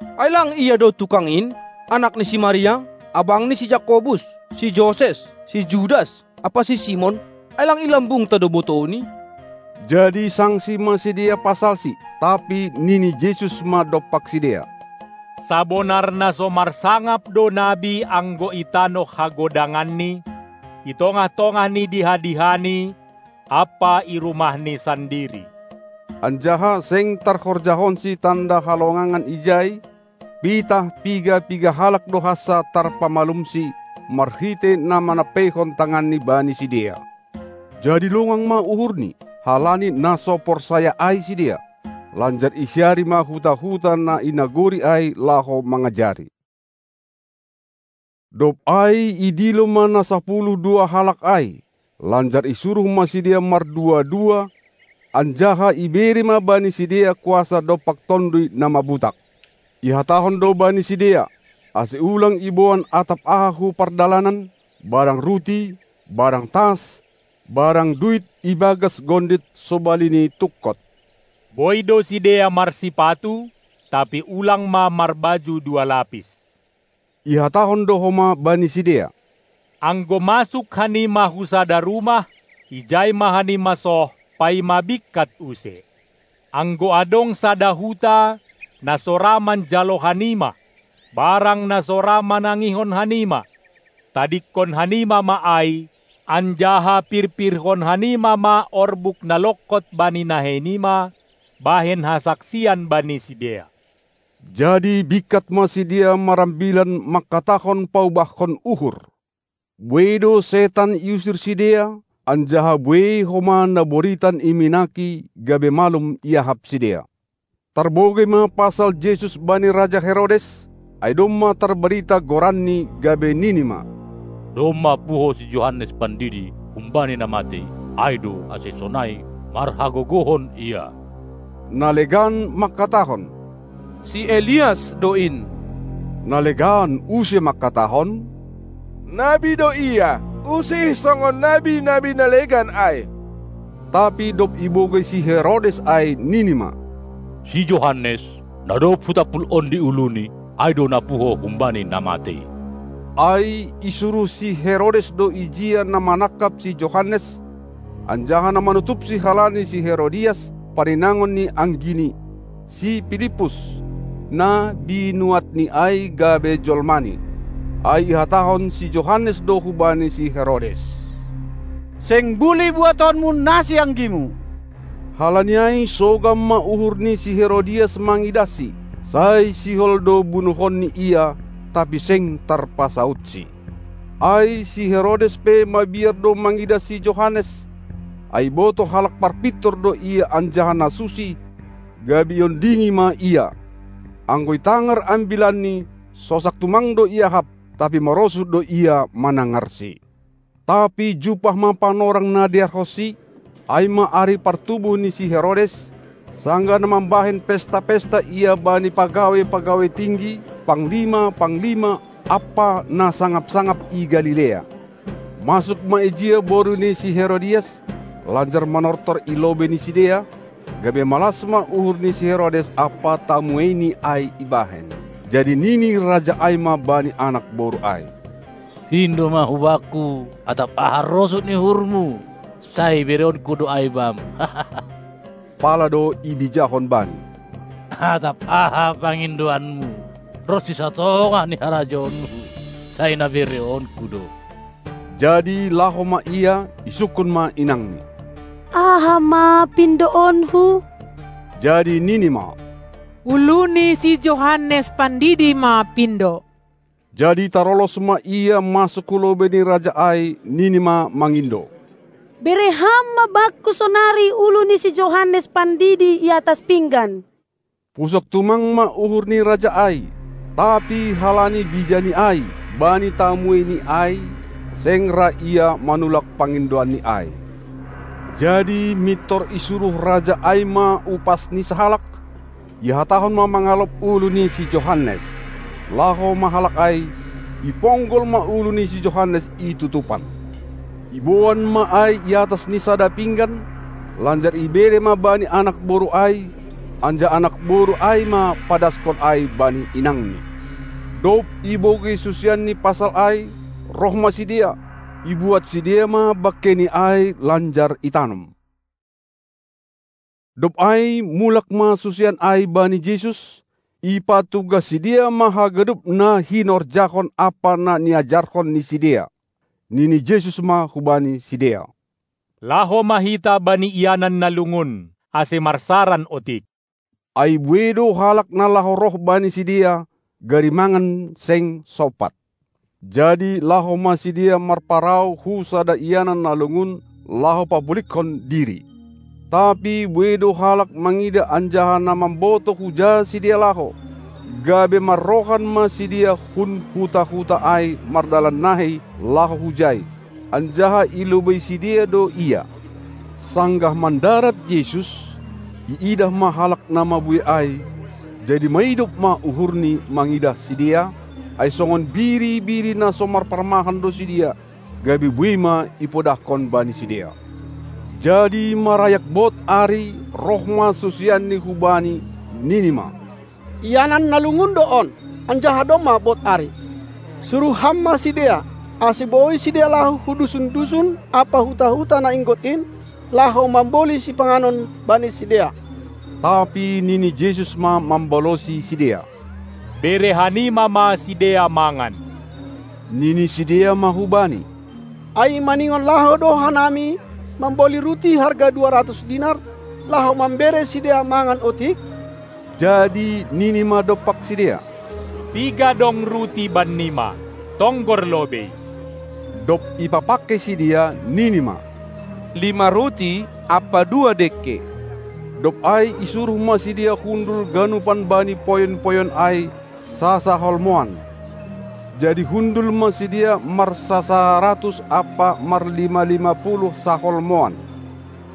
Ai lang Ia do tukang in, anak ni si Maria, abang ni si Jakobus, si Joses, si Judas ampa si Simon? Ai lang i lambungta do botouNi? Jadi sangsi ma sidea pasalSi. Tapi nini Jesus ma dompak sidea: Sabonar na so marsangap do nabi anggo i tanoh hagodanganni, i tongah-tongah ni diha-dihani ampa i rumahni sandiri. Anjaha seng tarhorjahonsi tanda halongangan ijai, pitah piga-piga halak do hansa tarpamalumsi, marhitei na manampeihon tanganni bani sidea. Jadi longang ma uhurNi, halani na so porsaya ai sidea. Lanjar isiari ma huta-huta na i nagori ai, laho mangajari. Dob ai idilo ma na sapuluh dua halak ai, lanjar isuruh ma sidea mardua-dua, anjaha ibere ma bani sidea kuasa dompak tonduy na mabutak. Ihatahon do bani sidea, ase ulang iboan atap aha hu pardalanan, barang ruti, barang tas, barang duit i bagas gondit sobali ni tungkot. Boi do sidea marsipatu, tapi ulang ma marbaju dua lapis. Ihatahon do homa bani sidea: Anggo masuk hanima hu sada rumah, ijai ma hanima soh, paima bingkat use. Anggo adong sada huta, na so ra manjalo hanima, barang na so ra manangihon hanima, tadingkon hanima ma ai, anjaha pirpirhon hanima ma orbuk na longkot bani nahei nima, bahen hasaksian bani sidea. Jadi bingkat ma sidea marambilan mangkatahon paubahkon uhur. Buei do setan iusir sidea, anjaha buei homa na boritan iminaki, gabe malum iahap sidea. Tarbogei ma pasal Jesus bani raja Herodes, ai domma tarbarita goranNi, gabe nini ma: Domma puho si Johannes Pandidi humbani na matei, ai do ase sonai marhagogohon Ia. Na legan mangkatahon: Si Elias do in. Na legan use mangkatahon: Nabi do ia, usih songon nabi-nabi na legan ai. Tapi dob ibogei si Herodes ai, nini ma: Si Johannes, na dob hutampul ondi uluni, ai do na puho humbani na matei. Ai isuruh si Herodes do ijia na manangkap si Johannes anjaha na manutupsi halani si Herodias, parinangon ni anggini, si Pilippus, na binuatni ai gabe jolmani. Ai ihatahon si Johannes do hubani si Herodes: Seng bulih buatonmu nasianggimu! Halani ai sogam ma uhur ni si Herodias mangidahsi; sai sihol do bunuhonni ia, tapi seng tarpasaudsi. Ai si Herodes pe mabiar do mangidah si Johannes, ai ibotoh halak parpintor do ia anjaha na susi, gabe iondingi ma ia. Anggo itangar ambilanni, sosak tumang do iahap, tapi marosuh do ia manangarsi. Tapi jumpah ma panorang na dear honsi, ai ma ari partubuh ni si Herodes, sanggah na mambahen pesta-pesta ia bani pagawai-pagawai tinggi, panglima-panglima, ampa na sangap-sangap i Galilea. Masuk ma ijia boru ni si Herodias lanjar manortor i lobei ni sidea, gabe malas ma uhur ni si Herodes ampa tamueini ai ibahen. Jadi nini raja ai ma bani anak boru ai: Pindo ma hubakku atap aha rosuh ni uhurmu, sai bereonku do ai bam. Pala do ibijahon bani: Atap aha pangindoanmu, ronsi satongah ni harajaonku, sai na bereonku do. Jadi laho ma ia, isungkun ma inangni: Aha ma pindoonku? Jadi nini ma: Ulu ni si Johannes Pandidi ma pindo! Jadi tarolos ma ia masuk hulobei ni raja ai, nini ma mangindo: Bere ham ma bakku sonari ulu ni si Johannes Pandidi i atas pinggan! Pusok tumang ma uhur ni raja ai, tapi halani bijani ai bani tamueini ai, seng ra ia manulak pangindoanni ai. Jadi mintor isuruh raja ai ma upasni sahalak, ihatahon ma mangalop ulu ni si Johannes. Laho ma halak ai, iponggol ma ulu ni si Johannes i tutupan; iboan ma ai i atas ni sada pinggan, lanjar ibere ma bani anak boru ai, anjaha anak boru ai ma padaskon ai bani inangni. Dob ibogei susianni pasal ai, roh ma sidea, ibuat sidea ma bangkei ni ai lanjar itanom. Dob ai mulak ma susian ai bani Jesus, ipatugah sidea ma haganup na hinorjahon ampa na niajarhon ni sidea. Nini Jesus ma hubani sidea: Laho ma hita bani ianan na lungun, ase marsaran otik. Ai buei do halak na laho roh bani sidea, gari mangan seng sompat. Jadi laho ma sidea marparau hu sada ianan na lungun, laho papuligkon diri, tapi buei do halak mangidah anjaha na mambotoh huja sidea laho, gabe marrohan ma sidea hun huta-huta ai mardalan nahei laho hujai, anjaha i lobei sidea do Ia. Sanggah mandarat Jesus, iidah ma halak na mabuei ai, jadi maidop ma uhurNi mangidah sidea, ai songon biri-biri na so marparmahan do sidea, gabe buei ma ipodahkon bani sidea. Jadi marayak bod ari, roh ma susianNi hu Bani, nini ma: Ianan na lungun do on, anjaha domma bod ari. Suruh Ham ma sidea, ase boi sidea laho hu dusun-dusun ampa huta-huta na inggot in, laho mamboli sipanganon bani sidea. Tapi nini Jesus ma mambalosi sidea: Bere hanima ma sidea mangan! Nini sidea ma hu Bani: Ai maningon laho do hanami mamboli ruti harga dua ratus dinar, laho mambere sidea mangan otik? Jadi nini ma dompak sidea: Piga dong ruti bannima? Tonggor lobei! Dob ipapangkei sidea, nini ma: Lima ruti ampa dua dengke. Dob ai isuruh ma sidea hundul ganupan bani poyon-poyon ai, sasaholmouan. Jadi hundul ma sidea marsasaratus ampa marlima-lima puluh saholmouan.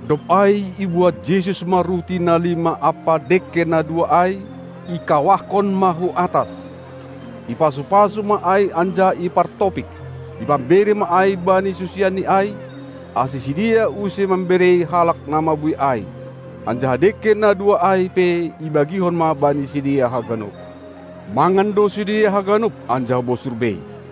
Dob ai ibuat Jesus ma ruti na lima ampa dengke na dua ai, ikawahkon ma hu atas, ipasu-pasu ma ai anjaha ipartopik. Ipambere ma ai bani susianNi ai, ase sidea use mamberei halak na mabuei ai. Anjaha dengke na dua ai pe ibagihon ma bani sidea haganup. Mangan do sidea haganup, anjaha bosur bei.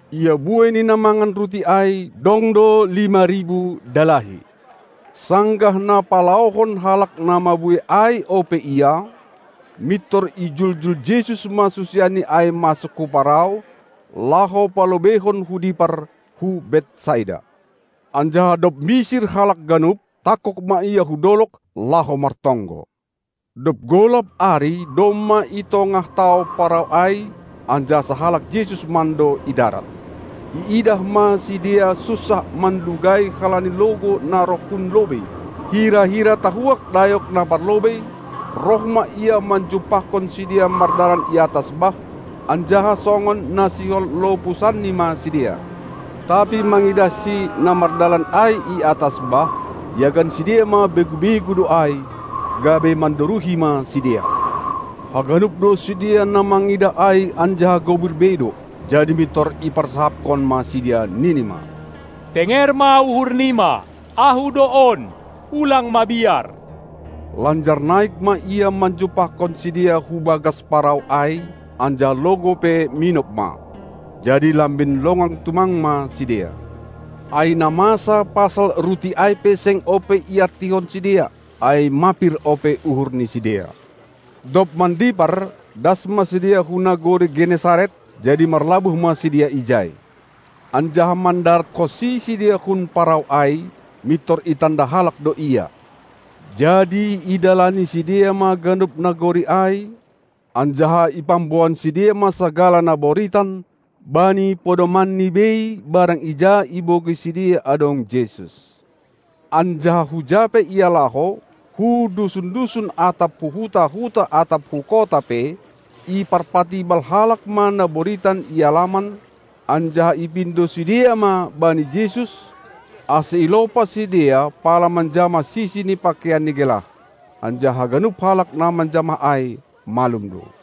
Ia buei ni na mangan ruti ai, dong do lima ribu dalahi. Sanggah na palaohon halak na mabuei ai ope Ia, mintor ijuljul Jesus ma susianni ai masuk hu parau, laho palobeihon hu dipar, hu Betsaida. Anjaha dob misir halak ganup, tangkog ma Ia hu dolog, laho martonggo. Dob golap ari domma i tongah tao parau ai, anjaha sahalak Jesus mando i darat. Iidah ma sidea sunsah manlugai halani logou na roh hun lobei. Hira-hira tahuak dayok na parlobei roh ma Ia manjumpahkon sidea mardalan i atas bah, anjaha songon na sihol lopusanNi ma sidea. Tapi mangidahSi na mardalan ai i atas bah, iagan sidea ma begu-begu do ai, gabe mandoruhi ma sidea. Haganup do sidea na mangidah ai anjaha gobir bei do. Jadi mintor iparsahapkon ma sidea, nini ma: Tenger ma uhur nima! Ahu do on! Ulang mabiar! Lanjar naik ma Ia manjumpahkon sidea hubagas parau ai, anjaha logou pe minop ma. Jadi lambin longang tumang ma sidea, ai na masa pasal ruti ai pe seng ope iartihon sidea, ai mapir ope uhur ni sidea. Dob mandipar das ma sidea hu nagori Genesaret, jadi marlabuh ma sidea ijai. Anjaha mandaratkonsi sidea hun parau ai, mintor itanda halak do Ia. Jadi idalani sidea ma ganup nagori ai, anjaha ipamboan sidea ma sagala na boritan bani podomanni bei barang ija ibogei sidea adong Jesus. Anjaha huja pe Ia laho, hu dusun-dusun atap hu huta-huta atap hu kota pe, iparpatibal halak ma na boritan i alaman, anjaha ipindo sidea ma bani Jesus, ase ilopas sidea pala manjamah sisi ni pakeianni gelah. Anjaha haganup halak na manjamah ai, malum do.